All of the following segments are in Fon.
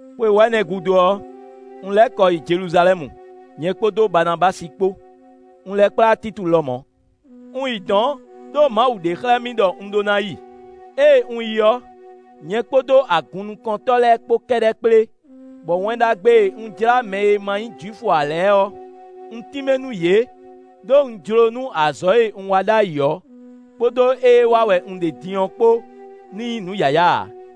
Xwe wɛ̌nɛ gúdo ɔ́, un lɛ́ kɔ yi Jeluzalɛ́mu, nyɛ kpódó Baanabási kpó; un lɛ́ kplá Títu lɔmɔ̌. Un yi dɔ̌n ɖó Mawu ɖe xlɛ́ mì ɖɔ un ɖó ná yi. Ée un yi ɔ́, nyɛ kpódó agunnukɔntɔ́ lɛ́ɛ kpó kɛ́ɖɛ́ kplé, bɔ Wɛn Ɖagbe e un jlá mɛ e ma nyí Jwifu ǎ lɛ́ɛ ɔ́, un tínmɛ nú yě, ɖó un jló nú azɔ̌ e un wa ɖ'ayǐ ɔ́, kpódó ée wa wɛ un ɖe din ɔ́ kpó ní nyí nǔ yǎyá ǎ.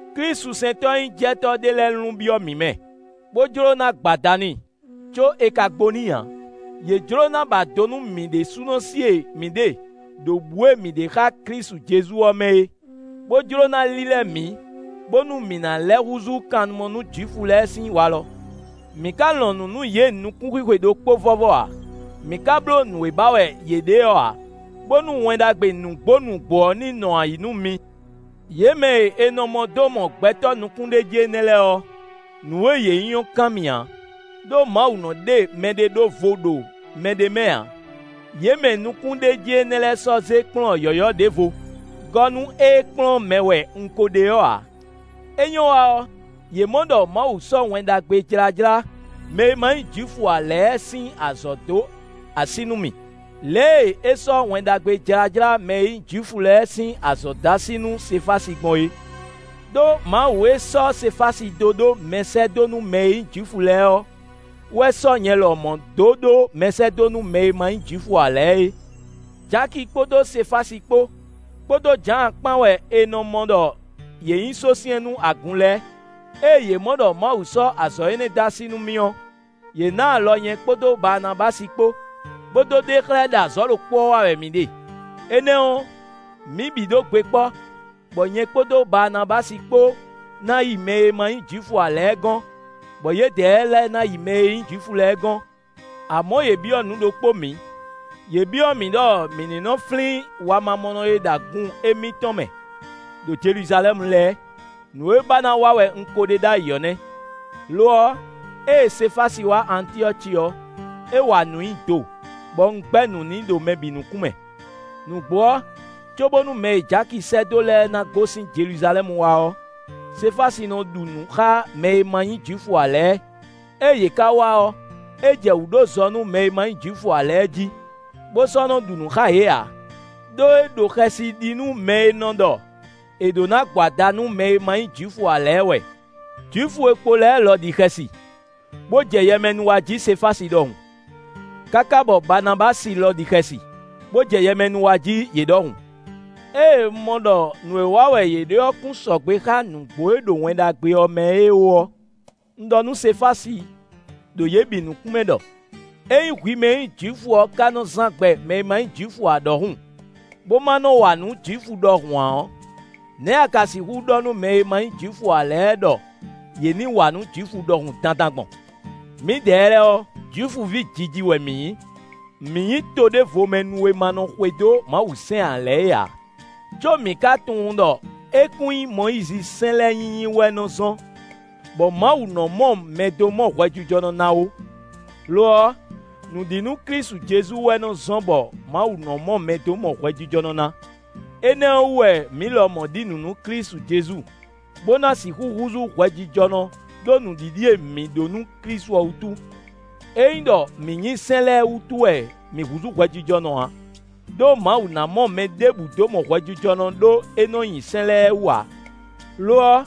Klísusɛntɔ́-nyíjɛtɔ́ ɖé lɛ́ɛ lun byɔ́ mǐ mɛ, bó jló ná gbo ada n'i, có è ka gbo n'i ǎ. Yě jló ná ba do nú mǐ ɖésúnɔ sí e mǐ ɖe ɖo bǔ e mǐ ɖe xá Klísu Jezu ɔ́ mɛ é, bó jló ná lílɛ́ mǐ, bónú mǐ ná lɛ́ húzú kannumɔ nú Jwifu lɛ́ɛ sín walɔ. Mǐ ka lɔn nǔ nú yě nukún xwixwe ɖokpó vɔ́vɔ́ ǎ. Mǐ ka bló nǔ e ba wɛ yě ɖe ɔ́ ǎ, bónú Wɛn Ɖagbe nǔgbó nǔgbó ɔ́ ní nɔ ayǐ nú mi. Yě mɛ e è nɔ mɔ dó mɔ gbɛtɔ́ nukúnɖéjí énɛ́ lɛ́ɛ ɔ́: “Nǔ e yě nyí ɔ́ kan mì ǎ, ɖó Mawu nɔ ɖe mɛɖé ɖó vo ɖo mɛɖé mɛ ǎ.” Yě mɛ nukúnɖéjí énɛ́ lɛ́ɛ sɔ́ zé kplɔ́n yɔ̌yɔ́ ɖěvo gɔ́ nú ée kplɔ́n mɛ wɛ un ko ɖe ɔ́ ǎ. É nyɔ́ wa ɔ́, yě mɔ ɖɔ Mawu sɔ́ Wɛn Ɖagbe jlájlá mɛ e ma nyí Jwifu ǎ lɛ́ɛ sín azɔ̌ dó así nú mì, lě e é sɔ́ Wɛn Ɖagbe jlájlá mɛ e nyí Jwifu lɛ́ɛ sín azɔ̌ dó así nú Sefási gbɔn é. Đó Mawu e sɔ́ Sefási dó ɖó mɛsɛ́dó nú mɛ e nyí Jwifu lɛ́ɛ ɔ́ wɛ sɔ́ nyɛ lɔmɔ̌ dó ɖó mɛsɛ́dó nú mɛ e ma nyí Jwifu ǎ lɛ́ɛ é. Jaki kpódó Sefási kpó, kpódó Jǎan kpán wɛ è nɔ mɔ ɖɔ yě nyí sósyɛ́n nú agun lɛ́ɛ; ée yě mɔ ɖɔ Mawu sɔ́ azɔ̌ énɛ́ dó así nú mì ɔ́, yě ná alɔ nyɛ kpódó Baanabási kpó, bó dó ɖe xlɛ́ ɖɔ azɔ̌ ɖokpó ɔ́ wa wɛ mǐ ɖe. Énɛ́ ɔ́, mǐ bǐ ɖó gbe kpɔ́, bɔ nyɛ kpódó Baanabási kpó ná yi mɛ e ma nyí Jwifu ǎ lɛ́ɛ gɔ́n, bɔ yědɛɛ lɛ́ɛ ná yi mɛ e nyí Jwifu lɛ́ɛ gɔ́n. Amɔ̌ yě byɔ́ nǔ ɖokpó mǐ. Yě byɔ́ mǐ ɖɔ mǐ ní nɔ́ flín wamamɔnɔ e ɖo agun émítɔn mɛ ɖo Jeluzalɛ́mu lɛ́ɛ. Nǔ e ba ná wa wɛ un ko ɖe ɖ'ayǐ ɔ́ nɛ́. Lo ɔ́, ée Sefási wá Antyɔ́ci ɔ́, é wa nǔ nyi do, bɔ un gbɛ́ nǔ n'i ɖo mɛ bǐ nukún mɛ. Nǔgbó ɔ́, cóbónú mɛ e Jaki sɛ́ dó lɛ́ɛ ná gosín Jeluzalɛ́mu wá ɔ́, Sefási nɔ ɖu nǔ xá mɛ e ma nyí Jwifu ǎ lɛ́ɛ. Ée yě ka wá ɔ́, é jɛ wǔ ɖó zɔ nú mɛ e ma nyí Jwifu ǎ lɛ́ɛ jí, bó sɔ́ nɔ ɖu nǔ xá yě ǎ; ɖó é ɖo xɛsi nú mɛ e nɔ ɖɔ è ɖǒ ná gbo ada nú mɛ e ma nyí Jwifu ǎ lɛ́ɛ wɛ. Jwifu e kpo lɛ́ɛ lɔ ɖi xɛsi, bó jɛ yɛmɛnú wa jí Sefási ɖɔhun, káká bɔ Baanabási lɔ ɖi xɛsi, bó jɛ yɛmɛnú wa jí yě ɖɔhun. Ée un mɔ ɖɔ nǔ e wa wɛ yě ɖe ɔ́ kún sɔgbe xá nǔgbó e ɖo Wɛn Ɖagbe ɔ́ mɛ é ó ɔ́, un ɖɔ nú Sefási ɖo yě bǐ nukún mɛ ɖɔ: “Ényí hwi mɛ e nyí Jwifu ɔ́ ka nɔ zán gbɛ mɛ e ma nyí Jwifu ǎ ɖɔhun, bó má nɔ́ wa nǔ Jwifu ɖɔhun ǎ ɔ́, nɛ̌ a ka sixú ɖɔ nú mɛ e ma nyí Jwifu ǎ lɛ́ɛ ɖɔ yě ní wa nǔ Jwifu ɖɔhun dandan gbɔn?” Mǐdɛɛ lɛ́ɛ ɔ́, Jwifuví jiji wɛ mǐ nyí; mǐ nyí toɖévomɛnu e ma nɔ xwedó Mawusɛ́n ǎ lɛ́ɛ é ǎ, có mǐ ka tunwun ɖɔ é kún nyí Mɔyízisɛ́n lɛ́ɛ nyinyi wɛ nɔ zɔ́n, bɔ Mawu nɔ mɔ mɛ dó mɔ hwɛjijɔnɔ ná ó. Lo ɔ́, nǔ ɖi nú Klísu Jezu wɛ nɔ zɔ́n bɔ Mawu nɔ mɔ mɛ dó mɔ hwɛjijɔnɔ ná. Énɛ́ ɔ́ wú wɛ mǐ lɔmɔ̌ ɖi nǔ nú Klísu Jezu, bó ná sixú húzú hwɛjijɔnɔ ɖó nǔɖiɖi e mǐ ɖó nú Klísu ɔ́ wútu. É nyí ɖɔ mǐ nyi sɛ́n lɛ́ɛ wútu wɛ mǐ húzú hwɛjijɔnɔ ǎ; ɖó Mawu ná mɔ mɛ ɖěbǔ dó mɔ hwɛjijɔnɔ ɖó é nɔ nyi sɛ́n lɛ́ɛ wú ǎ. Lo ɔ́,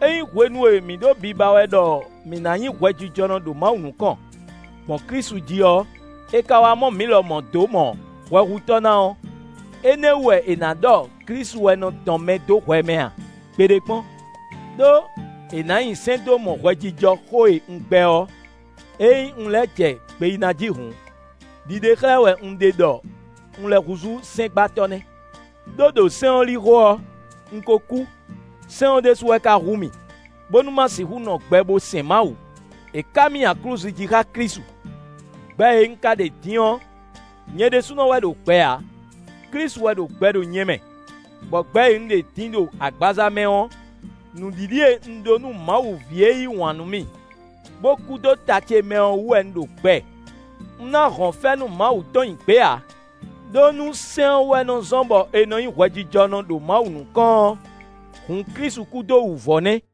ényí hwenu e mǐ ɖo biba wɛ ɖɔ mǐ ná nyí hwɛjijɔnɔ ɖo Mawu nukɔn, gbɔn Klísu jí ɔ́, è ka wá mɔ mǐ lɔmɔ̌ dó mɔ hwɛhutɔ́ ná ɔ́, énɛ́ wú wɛ è nǎ ɖɔ Klísu wɛ nɔ dɔn mɛ dó hwɛ mɛ a? Gbeɖé kpɔ́n! Đó è nǎ nyi sɛ́n dó mɔ hwɛjijɔ xó e un gbɛ́ ɔ́, ényí un lɛ́ jɛ gbe yí na jí hǔn, ɖiɖe xlɛ́ wɛ un ɖe ɖɔ un lɛ́ húzú sɛ́ngbatɔ́ nɛ́. Đó ɖo sɛ́n ɔ́ lixo ɔ́, un ko kú. Sɛ́n ɔ́ ɖésú wɛ ka hu mì, bónú má sixú nɔ gbɛ bó sɛn Mawu. È ká mì nyi aklúzu jí xá Klísu. Gbɛ e un ka ɖe din ɔ́, nyɛ ɖésúnɔ wɛ ɖo gbɛ ǎ, Klísu wɛ ɖo gbɛ ɖo nyɛ mɛ, bɔ gbɛ e un ɖe din ɖo agbaza mɛ ɔ́, nǔɖiɖi e un ɖó nú Mawu ví e yí wǎn nú mì, bó kú dó ta ce mɛ ɔ́ wú wɛ un ɖo gbɛ. Un ná hɔn fɛ́nú Mawu tɔn nyi gbě ǎ. Đó nú sɛ́n ɔ́ wɛ nɔ zɔ́n bɔ è nɔ nyí hwɛjijɔnɔ ɖo Mawu nukɔn ɔ́, hǔn Klísu kú dó wǔvɔ́ nɛ́.